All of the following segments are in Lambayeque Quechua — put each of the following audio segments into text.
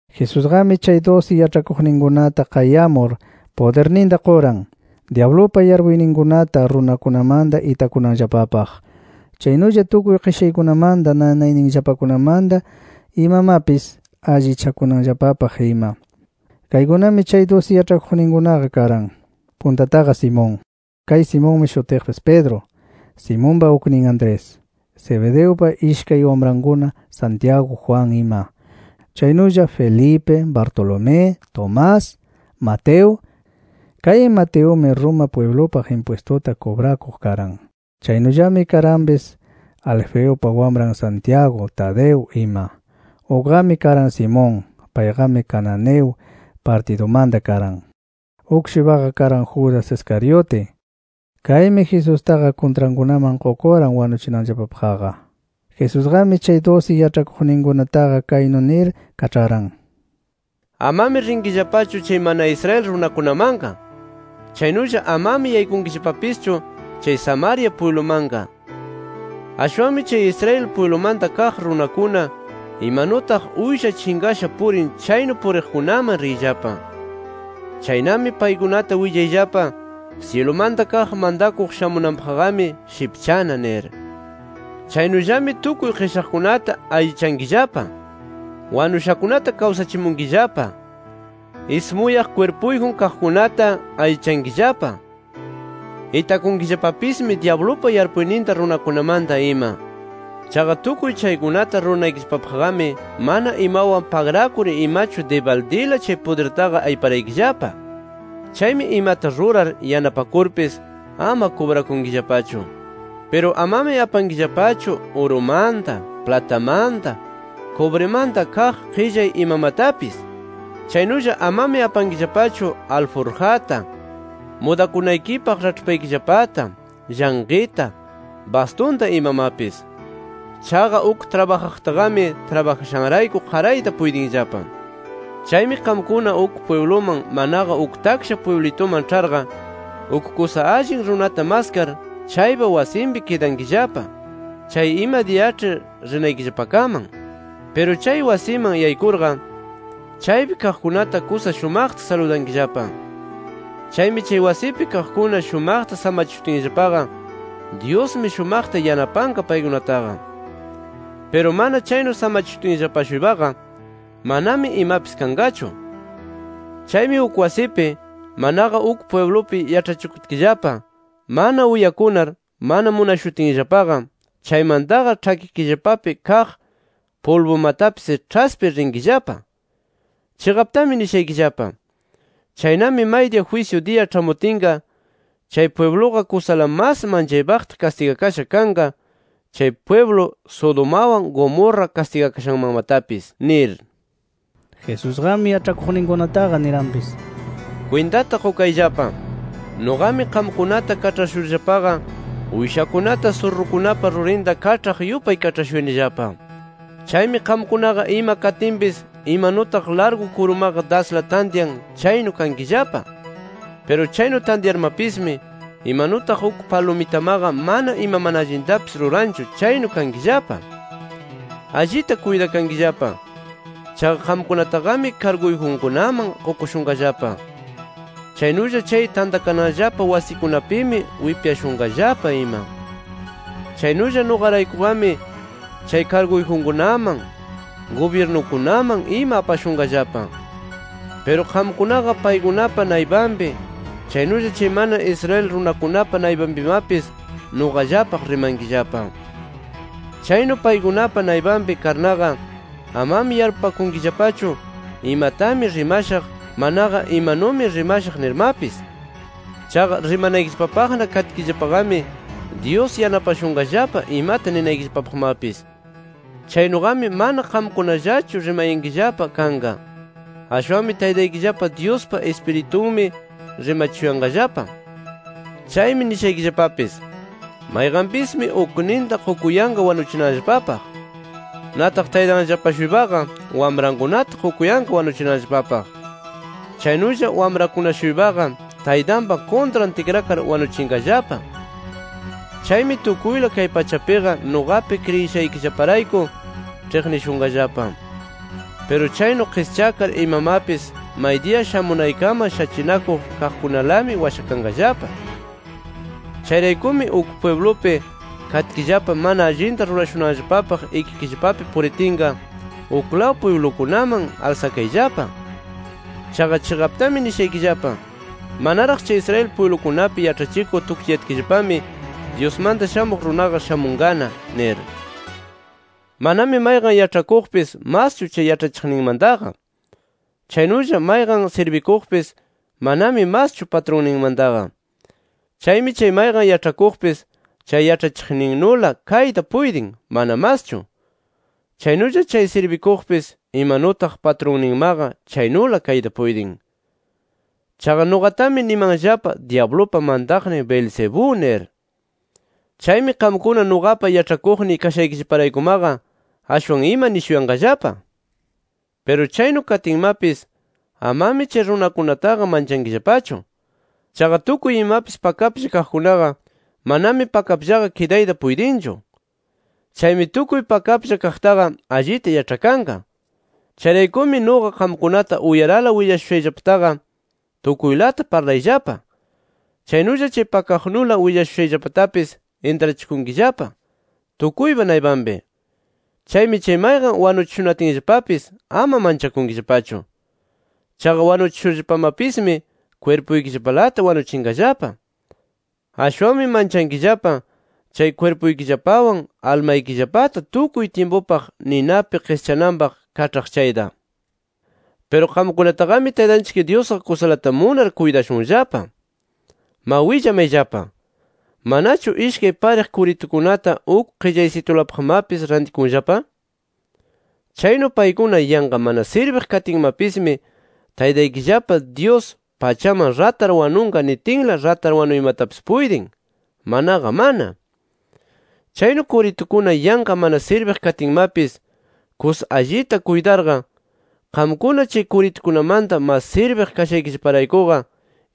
Jesusqami chay dusi yaĉhakuqninkunata qayamur, pudirninta quran, dyablupa yarpuyninkunata runakunamanta itakunanllapapaq. Chaynulla tukuy qishaykunamanta, nanayninllapakunamanta imamapis allichakunanllapapaq ima. Kaykunami chay dusi yaĉhakuqninkunaqa karan: Puntataqa, Simón (kay Simonmi shutiqpis Pedro), Simonpa uknin Andrés; Zebedeupa ishkay wamrankuna, Santiago, Juan ima. Chaynulla Felipe, Bartolomé, Tomás, Mateo. Kay Mateumi Roma pwiblupaq impwistuta kubrakuq karan. Chaynullami karanpis Alfeupa wamran Santiago, Tadeo ima. Ukqami karan Simón. Payqami Cananeo partidumanta karan. Uk-shuypaqa karan Judas Iscariote. Kaymi Jesustaqa kuntrankunaman qukuran wanuchinanllapapaqqa. Jesusqami chay dusi yaĉhakuqninkunataqa kaynu nir kaĉharan: “Amami rinkillapachu chay mana Israel runakunamanqa. Chaynulla amami yaykunkillapapischu chay Samaria pwiblumanqa nir. Ashwanmi chay Israel pwiblumanta kaq runakuna imanutaq uysha chinqasha purin chaynu puriqkunaman riyllapa. Chaynami paykunata willayllapa, syilumanta kaq mantakuq shamunanpaqqami shipchana nir. Chaynullami tukuy qishaqkunata allichankillapa, wanushakunata kawsachimunkillapa, ismuyaq kwirpuyjun kaqkunata allichankillapa, itakunkillapapismi dyablupa yarpuyninta runakunamanta ima. Chaqa tukuy chaykunata ruranaykillapapaqqami mana imawan pagrakur imachu dibaldila chay pudirtaqa ayparaykillapa. Chaymi imata rurar yanapakurpis ama kubrakunkillapachu. “Piru amami apankillapachu urumanta, platamanta, kubrimanta kaq qillay imamatapis. Chaynulla amami apankillapachu alburjata, mudakunaykipaq raĉhpaykillapata, llanqita, bastunta imamapis. Chaqa uk trabajaqtaqami trabajashanrayku qarayta puytinllapa. “Chaymi qamkuna uk pwibluman manaqa uk taksha pwiblituman ĉharqa, uk kusa allin runata maskar, chaypa wasinpi kidankillapa chay ima diyaĉhi rinaykillapakaman. Piru chay wasiman yaykurqa chaypi kaqkunata kusa shumaqta saludankillapa. Chaymi chay wasipi kaqkuna shumaqta samachishutinllapaqa Dyusmi shumaqta yanapanqa paykunataqa. Piru mana chaynu samachishutinllapa-shuypaqa manami imapis kanqachu. Chaymi uk wasipi manaqa uk pwiblupi yaĉhachikutkillapa mana uyakunar mana munashutinllapaqa, chaymantaqa ĉhakikillapapi kaq pulbumatapis ĉhaspir rinkillapa. Chiqaptami nishaykillapa: Chaynami maydiya jwisyu diya ĉhamutinqa, chay pwibluqa kusala mas manchaypaqta kastigakasha kanqa chay pwiblu Sodomawan Gomorra kastigakashanmanmatapis nir”. Jesusqami yaĉhakuqninkunataqa niranpis: “¡Kwintata qukayllapa! Nuqami qamkunata kaĉhashurllapaqa uyshakunata surrukunapa rurinta kaĉhaq yupay kaĉhashuyanillapa. Chaymi qamkunaqa ima katinpis imanutaq largu kurumaqa dasla tantyan chaynu kankillapa. Piru chaynu tantyarmapismi imanutaq uk palumitamaqa mana ima mana allintapis ruranchu chaynu kankillapa. Allita kuytakankillapa. Chaqa qamkunataqami karguyjunkunaman qukushunqallapa. Chaynulla chay tantakananllapa wasikunapimi wipyashunqallapa ima. Chaynulla nuqaraykuqami chay karguyjunkunaman, gubyirnukunaman ima apashunqallapa. Piru qamkunaqa paykunapa naypanpi chaynulla chay mana Israel runakunapa naypanpimapis nuqallapaq rimankillapa. Chaynu paykunapa naypanpi karnaqa, amami yarpupakunkillapachu, imatami rimashaq, manaqa imanumi rimashaq nirmapis. Chaqa rimanaykillapapaqna katkillapaqami Dyus yanapashunqallapa imata ninaykillapapaqmapis. Chaynuqami mana qamkunallachu rimayankillapa kanqa. Ashwanmi Taytaykillapa Dyuspa Ispiritunmi rimachishunqallapa. “Chaymi nishaykillapapis: Mayqanpismi ukninta qukuyanqa wanuchinanllapapaq. Nataq taytanllapa-shuypaqa wamrankunata qukuyanqa wanuchinanllapapaq. Chaynulla wamrakuna-shuypaqa taytanpa kuntran tikrakar wanuchinqallapa. Chaymi tukuyla kay pachapiqa nuqapi kriyishaykillaparayku ĉhiqnishunqallapa. Piru chaynu qischakar imamapis maydiya shamunaykaman shachinakuq kaqkunalami washakanqallapa. Chayraykumi uk pwiblupi katkillapa mana allinta rurashunanllapapaq ikikillapapi puritinqa, uklaw pwiblukunaman alsakayllapa. Chaqa chiqaptami nishaykillapa: Manaraq chay Israel pwiblukunapi yaĉhachikur tukchiyatkillapami Dyusmanta Shamuq Runaqa shamunqana nir. “Manami mayqan yaĉhakuqpis maschu chay yaĉhachiqninmantaqa. Chaynulla mayqan sirbikuqpis manami maschu patrunninmantaqa. Chaymi chay mayqan yaĉhakuqpis chay yaĉhachiqninnula kayta puytin mana maschu. Chaynulla chay sirbikuqpis imanutaq patrunninmaqa chaynula kayta puytin. Chaqa nuqatami nimanllapa dyablupa mantaqnin Beelzebú nir. Chaymi qamkuna nuqapa yaĉhakuqniy kashaykillaparaykumaqa ashwan ima nishuyanqallapa. “Piru chaynu katinmapis amami chay runakunataqa manchankillapachu. Chaqa tukuy imapis pakaplla kaqkunaqa manami pakapllaqa kidayta puytinchu. Chaymi tukuy pakaplla kaqtaqa allita yaĉhakanqa. Chayraykumi nuqa qamkunata uyarala willashushayllapataqa, tukuylata parlayllapa. Chaynulla chay pakaqnula willashushayllapatapis intrachikunkillapa, tukuypa naypanpi. Chaymi chay mayqan wanuchishunatinllapapis ama manchankillapachu. Chaqa wanuchishurllapamapismi kwirpuykillapalata wanuchinqallapa. Ashwanmi manchankillapa chay kwirpuykillapawan almaykillapata tukuy tyimpupaq ninapi qischakananpaq kaĉhaq chayta. “Piru qamkunataqami Taytanchik Dyusqa kusalata munar kuytashunllapa. Ma willamayllapa: ¿Manachu ishkay pariq kuritukunata uk qillaysitulapaqmapis rantikunllapa? Chaynu paykuna yanqa mana sirbiq katinmapismi, Taytaykillapa Dyus pachaman ratar wanunqa nitin, ratar wanuymatapis puytin, manaqa mana. Chaynu kuritukuna yanqa mana sirbiq katinmapis kusa allita kuytarqa, qamkuna chay kuritukunamanta mas sirbiq kashaykillaparaykuqa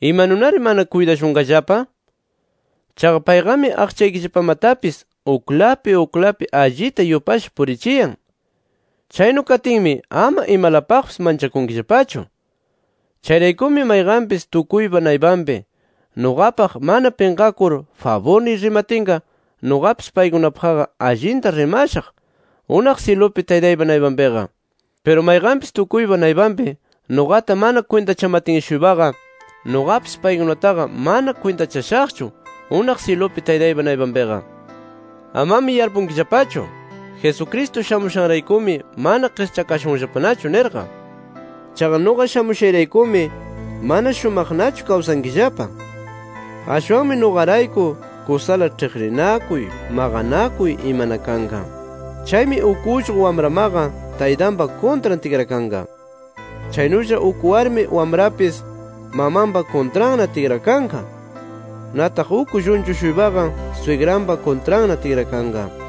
¿imanunari mana kuytashunqallapa? Chaqa payqami aqchaykillapamatapis uklapi uklapi allita yupasha purichiyan. Chaynu katinmi ama imalapaqpis manchakunkillapachu. “Chayraykumi mayqanpis tukuypa naypanpi, nuqapaq mana pinqakur faburniy rimatinqa, nuqapis paykunapaqqa allinta rimashaq, unaq syilupi Taytaypa naypanpiqa. Piru mayqanpis tukuypa naypanpi, nuqata mana kwintachamatin-shuypaqa, nuqapis paykunataqa mana kwintachashaqchu unaq syilupi Taytaypa naypanpiqa. “Amami yarpunkillapachu: Jesucristo shamushanraykumi mana qischakashunllapanachu nirqa. Chaqa nuqa shamushayraykumi mana shumaqnachu kawsankillapa. Ashwanmi nuqarayku kusala ĉhiqninakuy, maqanakuy imana kanqa. Chaymi uk ullqu wamramaqa taytanpa kuntran tikrakanqa. Chaynulla uk warmi wamrapis mamanpa kuntranna tikrakanqa. Nataq uk llunchu-shuypaqa swigranpa kuntranna tikrakanqa.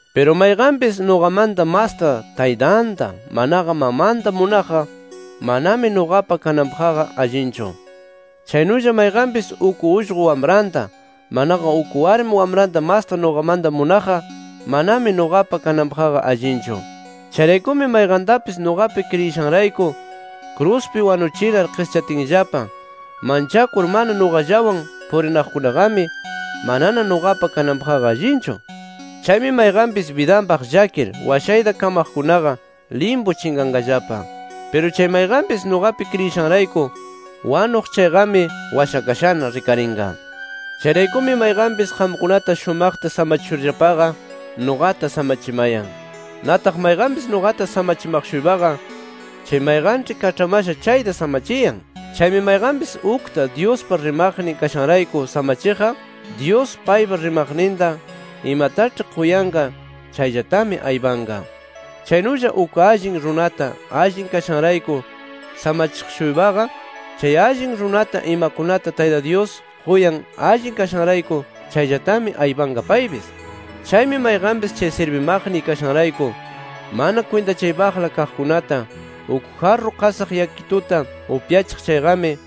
Piru mayqanpis nuqamanta masta taytanta, manaqa mamanta munaqqa, manami nuqapa kananpaqqa allinchu. Chaynulla mayqanpis uk ullqu wamranta, manaqa uk warmi wamranta masta nuqamanta munaqqa, manami nuqapa kananpaqqa allinchu. Chayraykumi mayqantapis nuqapi kriyishanrayku kruspi wanuchinar qischatinllapa manchakur mana nuqallawan purinaqkunaqami manana nuqapa kananpaqqa allinchu. Chaymi mayqanpis bidanpaq llakir washayta kamaqkunaqa limpu chinqanqallapa. Piru chay mayqanpis nuqapi kriyishanrayku wanuq chayqami washakashana rikarinqa. “Chayraykumi mayqanpis qamkunata shumaqta samachishurllapaqa, nuqata samachimayan. Nataq mayqanpis nuqata samachimaq-shuypaqa, chay mayqanĉhi kaĉhamasha chayta samachiyan. Chaymi mayqanpis ukta Dyuspa rimaqnin kashanrayku samachiqqa, Dyus paypa rimaqninta imataĉhi quyanqa chayllatami aypanqa. Chaynulla uk allin runata allin kashanrayku samachiq-shuypaqa, chay allin runata imakunata Tayta Dyus quyan allin kashanrayku, chayllatami aypanqa paypis. Chaymi mayqanpis chay sirbimaqniy kashanrayku mana kwintachaypaqla kaqkunata uk jarru qasaq yakituta upyachiq chayqami,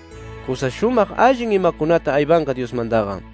kusa shumaq allin imakunata aypanqa Dyusmantaqa”.